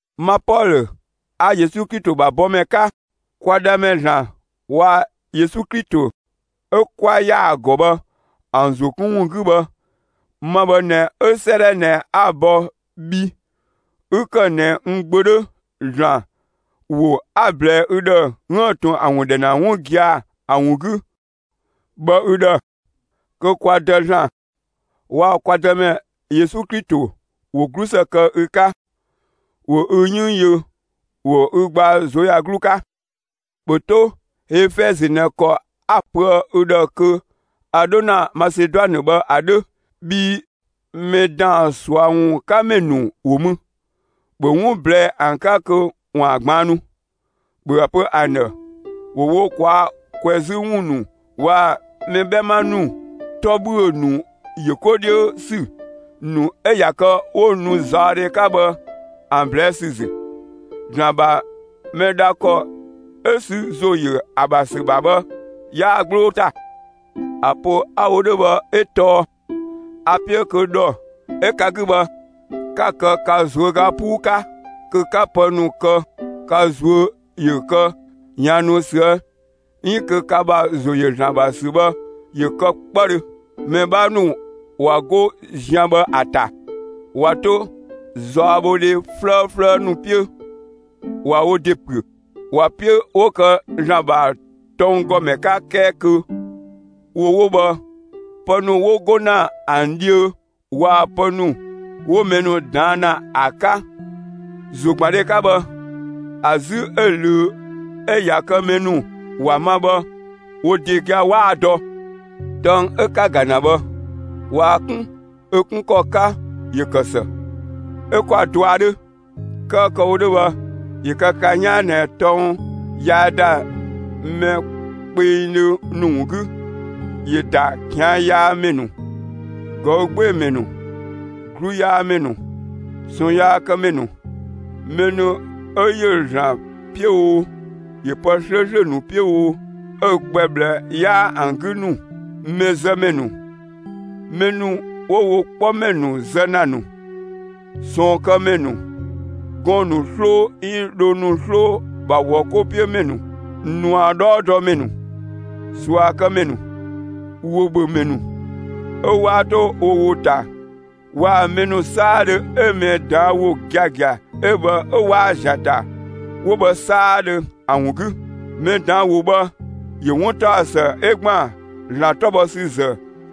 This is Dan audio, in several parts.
Ma Pɔlö 'a Yesu Klito ‑bha bɔmɛ 'ka, kwa Dhamɛ ‑Zlan waa‑ Yesu Klito 'ö 'kwa ‑yaa ‑gɔ bhë ‑an ‑zo 'kun ‑wun 'gü bhë, ma bhë ꞊nɛ 'ö 'sëëdhɛ ꞊nɛ 'a‑ bɔ bhi 'ü ‑kë ꞊nɛ n gbö 'dhö (‑Zlan ‑wo 'a‑ ꞊blɛɛ ü ‑dhë 'üën‑ ꞊tun ‑a ‑wun ‑dhɛ ‑na 'wun gia‑ ‑a ‑wun 'gü) bhë ü ‑dhë, kö kwa Dë ‑Zlan waa‑ kwa Dëmɛ Yesu Klito ‑wo 'glusë kë ü 'ka, ‑wo ü 'yënng yö, ‑wo ü gbaa ꞊zuöyagluu 'ka. ‑Bhö 'to Efɛzö ꞊nɛ ‑kɔ 'a‑ pöë ü ‑dhë kö a 'dho ‑na Maseduanë bhë ‑a 'dhö. Bhii mɛ ‑daan ꞊sua ‑wun 'ka ‑mɛ ‑nu ‑wo mü; ‑bhö 'wun ꞊blɛɛ'‑ ‑an 'ka kö ‑waan ꞊gbaannu! ‑Bhö ‑a pö ‑an ‑dhë ‑wo wo ꞊kwaa' ꞊kwɛzü ‑wun ‑nu waa‑ mɛ 'bhɛma ‑nu 'tɔ ‑bhüö ‑nu ‑yö 'ko 'dhiö ‑sü ‑nu 'ö ꞊ya kë 'wo nu zaɔdhe 'ka bhë ‑an ꞊blɛɛ' ‑sü ‑zü. ‑Zlan ‑bha mɛ dha ‑kɔ 'ö sü ‑zo ‑yö ‑a ‑bha ‑sü ‑bha bhë, 'yaa‑ 'gbloo ‑ta. ‑A pö 'a‑ wo 'dhö bhë 'ö tɔɔ a‑ 'piö kö ‑dhɔ 'ö ka 'gü bhë, ka‑ kë ka ꞊zuöga 'puu 'ka, kö 'ka pë ‑nu kë, ka ꞊zuö' ‑yö kë ꞊yaannu ꞊süë' 'iin kö ka ‑bha ‑zo ‑yö ‑Zlan ‑bha ‑sü bhë, ‑yö kë 'kpëdhö. Mɛ 'bhaa ‑nu ꞊wa 'go zian bhë ‑a ‑ta ꞊wa 'to zaɔbhodhe 'flëëflëë ‑nu 'piö ꞊wa wo ‑de ‑püö. ‑Wa 'piö 'wo kë ‑Zlan ‑bha tɔnggɔmɛ 'ka 'kɛɛ kö wo 'wo bhë, pë ‑nu 'wo 'go ‑na ‑an dhiö waa‑ pë ‑nu 'wo mɛ ‑nu ꞊daan' ‑na ‑a 'ka ‑zogbandhe 'ka bhë, ‑a 'zü 'ö‑ ꞊löö 'ö ꞊ya kë mɛ ‑nu ‑wa ma bhë, wo ‑de gia‑ 'waa‑ dɔ. Tɔng 'ö 'ka‑ ‑ga ‑na bhë, ꞊waa‑ 'kun ö 'kun ‑kɔ 'ka, ‑yö ‑kë ‑së; 'ö 'kwa‑ dɔa 'dhö. 'Kɛɛ kë‑ wo 'dhö bhë, ‑yö kë ka 'yaan ꞊nɛ tɔng yaa ‑da mɛ kpengdhö ‑nu ‑wun 'gü; ‑yö ‑da ꞊kian' yaa ‑mɛ ‑nu, ꞊gɔü' 'gbee‑ ‑mɛ ‑nu, 'gluyaamɛ ‑nu, ꞊sɔɔnyaakëmɛ ‑nu, mɛ ‑nu 'ö ‑yö ‑Zlan 'piö oo, ‑yö pë 'slööslö ‑nu 'piö oo, 'ö‑ gbɛ ꞊bhlë 'yaa ‑an 'gü ‑nu, mɛzëmɛ ‑nu, mɛ ‑nu 'wo wo 'kpɔmɛ ‑nu zë ‑na ‑nu, ꞊sɔɔnkëmɛ ‑nu, gɔɔn‑ ‑nu 'sloo 'iin dhoo ‑nu 'sloo ‑bha ‑wɔ 'ko 'piö ‑mɛ ‑nu, ꞊nua 'dhɔɔdɔmɛ ‑nu, ꞊suakëmɛ ‑nu, ‑wobhömɛ ‑nu 'ö 'waa 'to wo ‑wo ‑ta waa‑ mɛ ‑nu 'saadhö 'ö mɛ ꞊daan' ‑wo giagia 'ö bhë 'ö 'waa‑ ‑zian ‑ta 'wo bhë 'saadhö ‑an ‑wun 'gü. Mɛ ꞊daan' ‑wo bhë, ‑yö 'wuntaɔsë 'ö ‑gban ‑Zlan 'tɔ bhɔ ‑sü ‑zë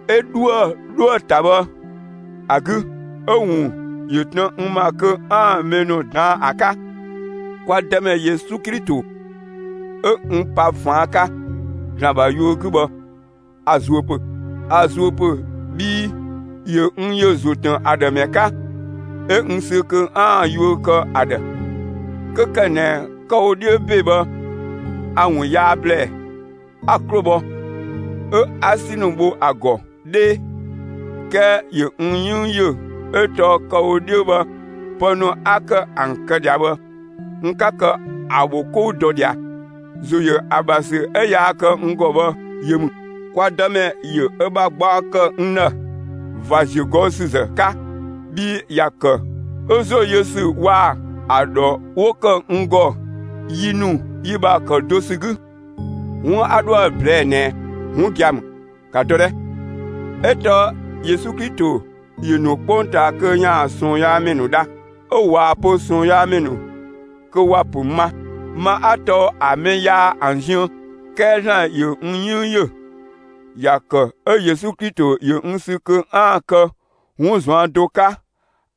'ö 'dhuë‑ 'dhoë‑ ‑ta bhë ‑a 'gü; 'ö‑ ‑wun ‑yö tën n ‑ma kö 'aan‑ mɛ ‑nu ꞊daan' ‑a 'ka. Kwa Dëmɛ Yesu Klito 'ö n pa ꞊faan' 'ka ‑Zlan ‑bha yuö 'gü bhë, a‑ zuö ‑pö. A‑ zuö ‑pö bhii ‑yö n ‑yö ‑zo ‑tën ‑a ‑dhë ‑mɛ 'ka, 'ö n sü kö 'aan‑ yuö kë ‑a ‑dhë, 'kö ‑kë ꞊nɛ kë‑ wo 'dhiö ‑be bhë a‑ ‑wun yaa ‑blɛɛ, 'a‑ 'klo bhɔ, 'ö 'a 'si ‑nu bho ‑a ‑gɔ 'dhee. 'Kɛɛ ‑yö n 'yënng ‑yö 'ö tɔɔ kë‑ wo 'dhiö bhë, pë ‑nu 'a ‑kë ‑an kë ꞊dhia bhë, n 'ka kë ‑a ‑bho 'kou dɔ ꞊dhia; ‑zo ‑yö ‑a ‑bha ‑sü 'ö yaa kë n ‑gɔ bhë, yö ‑mü. Kwa Dëmɛ ‑yö ö ‑bha gbaɔ ‑kë n ‑dhë ꞊va ‑ziögɔüsüzë 'ka, bhii ‑ya ‑kë 'ö ‑zo yö ‑sü waa‑ ‑a ‑dhɔ 'wo ‑kë n ‑gɔ yi ‑nu yi ‑bha ‑kë do ‑sü 'gü. 'Wun 'a 'dhoë‑ ꞊blɛɛ'‑ ꞊nɛ 'wun gia‑ ‑mü. ‑Ka dɔ 'dhɛ! 'O tɔɔ Yesu Klito ‑yö ‑nu 'kpongtaa kö ‑yaan ꞊sɔɔnyaamɛ ‑nu dha; 'ö waa‑ pö ꞊sɔɔnyaamɛ kö ‑wa ‑pö ma; ma 'a tɔɔ ‑a mɛ yaa ‑an ziën. 'Kɛɛ ‑Zlan ‑yö n 'yënng ‑yö; ‑ya ‑kë 'ö Yesu Klito ‑yö n sü kö 'aan‑ kë 'wun ꞊zuan' do 'ka,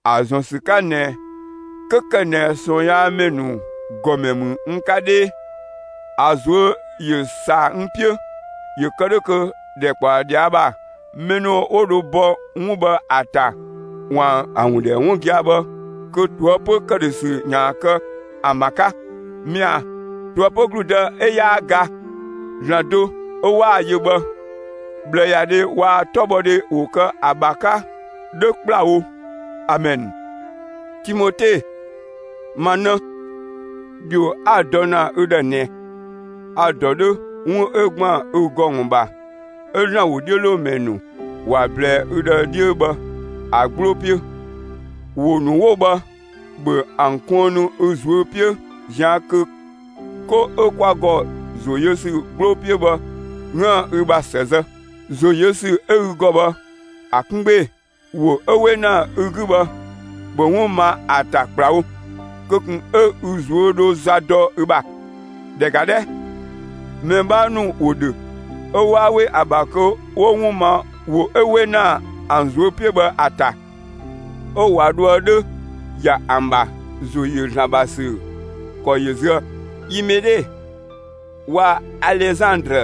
‑a ‑zɔn ‑sü 'ka ꞊nɛ 'kö ‑kë ꞊nɛ ꞊sɔɔnyaamɛ ‑nu ‑gɔmɛ ‑mü n 'ka 'dhee, ‑a ꞊zuö' ‑yö ‑saa n 'piö, ‑yö kë 'dhö kö ‑dhɛkpaɔ ꞊dhia' ‑bha, mɛ ‑nu 'wo dho bɔ 'wun bhë ‑a ‑ta ‑waan ‑a ‑wun ‑dhɛ 'wun gia‑ bhë, kö ꞊toëpö ‑këdhösü ‑yaan kë ‑an ‑bha 'ka. Mɛa‑, ꞊toëpö ‑gludë 'ö 'yaa ga, ‑Zlan do 'ö 'waa‑ yö bhë, ꞊bhlëyadhɛ waa‑ 'tɔbhɔdhe ‑wo kë ‑a ‑bha 'ka 'dhö ‑kplawo! Amɛn. Timote, ma 'në, ‑dhio 'a‑ dɔ ‑na ü ‑dhë ꞊nɛ, a‑ ‑dɔ 'dhö 'wun 'ö ‑gban ü ‑gɔ ‑wun ‑bha 'ö ‑Zlan ‑wodhiölomɛ ‑nu ‑wa ꞊blɛɛ ü ‑dhë 'dhiö bhë ‑a 'gbloo 'piö; ‑wo ‑nu 'wo bhë, ‑bhö ‑an kuënnu ü ꞊zuö' 'piö ꞊zian' kö 'ko 'ö kwa ‑gɔ ‑zo yö ‑sü 'gbloo 'piö bhë 'üën‑ ü ‑bha ‑së zë; ‑zo yö ‑sü 'ö ü ‑gɔ bhë ‑a 'kun 'gbee‑; ‑wo 'ö 'we ‑na ü 'gü bhë, ‑bhö 'wun ma ‑a ‑ta ‑kplawo! Kö ꞊kun 'ö ü zuö 'dho za dɔ ü ‑bha. ‑Dhɛ ‑ga 'dhɛ! Mɛ 'bhaa ‑nu ‑wo ‑dhö 'ö waa 'we ‑a ‑bha kö 'wo 'wun ma ‑wo 'ö 'we ‑na ‑an ꞊zuö' 'piö bhë ‑a ‑ta, 'ö ꞊wa dhoë 'dhö ꞊ya ‑an ‑bha ‑zo ‑yö ‑Zlan ‑bha ‑sü ‑kɔ yö zuë‑. Imene waa‑ Alezandrë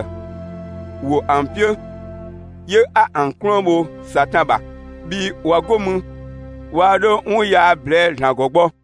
‑wo ‑an 'piö, 'yö 'a ‑an 'kluën bho Satan ‑bha; bhii ꞊wa 'go mü, waa 'dho 'wun yaa ꞊blɛɛ'‑ ‑Zlan ‑gɔ gbɔ.